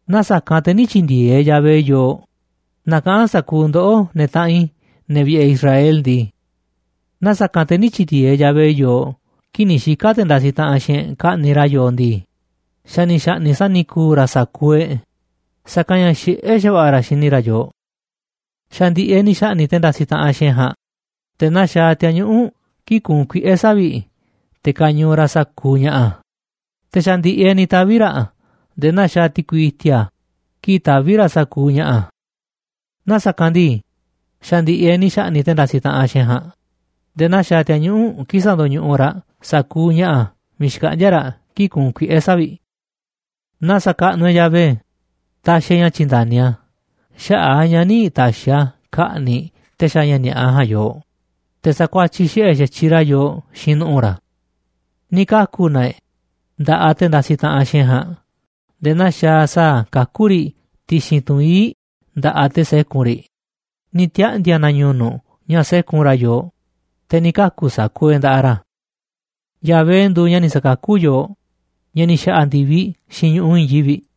Naaꞌ sa̱kanꞌ te̱ nï̱ tyi̱ndi̱e̱eꞌ Yahvé yooꞌ, na kaꞌa̱n sa̱kuuꞌ ndoꞌó, ne̱ taꞌanꞌ i̱, ne̱ vi̱ꞌe̱ Israel ndii, naaꞌ sa̱kanꞌ te̱ nï̱ tyi̱ndi̱e̱eꞌ Yahvé yooꞌ kii̱ꞌ ni̱ xika̱ te̱ ndasiꞌ taꞌanꞌ xiinꞌ e̱ꞌ ka̱ꞌni̱ꞌ ra̱ yooꞌ ndii, xa̱ ni̱ xa̱ꞌni̱ꞌ sa̱ni̱ku̱u̱ ra̱ sa̱kuuꞌ e̱ꞌ, sa̱kanꞌ ña̱ xiꞌé xa̱va̱ꞌa̱ ra̱ xini ra̱ yooꞌ. Xa̱ ndi̱ꞌi̱ e̱ꞌ ni̱ xa̱ꞌni̱ꞌ te̱ ndasiꞌ taꞌanꞌ xiinꞌ e̱ꞌ ja̱a̱nꞌ nde̱e̱ naa xaaꞌ ti̱a̱ñuꞌu̱ꞌ kii̱ꞌ kuunꞌ kuiꞌe̱ savi̱ꞌ te̱ kañuuꞌ raꞌ sa̱kuuꞌ ña̱ꞌa̱, te̱ xa̱ ndi̱ꞌi̱ e̱ꞌ ni̱ tavi̱ ra̱ nde̱e̱ naa xaaꞌ ti̱kui i̱ti̱a̱ kii̱ꞌ taví raꞌ sa̱kuuꞌ ña̱ꞌa̱. Naaꞌ sa̱kanꞌ ndii, xa̱ ndi̱ꞌi̱ e̱ꞌ ni̱ xa̱ꞌni̱ꞌ te̱ ndasiꞌ taꞌanꞌ xiinꞌ e̱ꞌ ja̱a̱nꞌ nde̱e̱ naa xaaꞌ ti̱a̱ñuꞌu̱ꞌ kii̱ꞌ sandoñuꞌuꞌ raꞌ sa̱kuuꞌ ña̱ꞌa̱ miiꞌ xkaꞌndíá raꞌ kii̱ꞌ kuunꞌ kuiꞌe̱ savi̱ꞌ. Na sa̱kaꞌnuꞌ e̱ꞌ Yahvé taxiꞌ e̱ꞌ ña̱ tyi̱nda̱ni a̱, xaꞌa̱ꞌ a̱ ña̱ nï̱ ta̱xi̱ na a̱ ka̱ꞌni̱ꞌ te̱ xaaꞌ ña̱ ni̱a̱ꞌa ja̱a̱nꞌ yooꞌ te̱ sa̱kuatyiꞌ xiꞌe̱ xa̱tyiꞌ ra̱ yooꞌ xiinꞌ nu̱ꞌu̱ ra̱. Ni̱ kaku̱ na e̱ꞌ nda̱ꞌaꞌ te̱ ndasiꞌ taꞌanꞌ xiinꞌ e̱ꞌ ja̱a̱nꞌ nde̱e̱ naa xaaꞌ sa̱a̱ kakú riꞌ ti̱xi̱n tunꞌ ii̱ꞌ nda̱ꞌaꞌ te̱ sékun riꞌ, ni̱ tiaꞌndi̱a̱ na ñu̱nu̱ꞌ ña̱ sékun ra̱ yooꞌ, te̱ ni̱ kaku̱ sa̱kuuꞌ e̱ꞌ nda̱ꞌaꞌ ra̱. Yahvé nduuꞌ ña̱ ni̱ sa̱kakú yooꞌ, ña̱ ni̱ xa̱ꞌa̱ ndi̱viꞌ xiinꞌ ñu̱ꞌuꞌ i̱i̱n yivi̱ꞌ.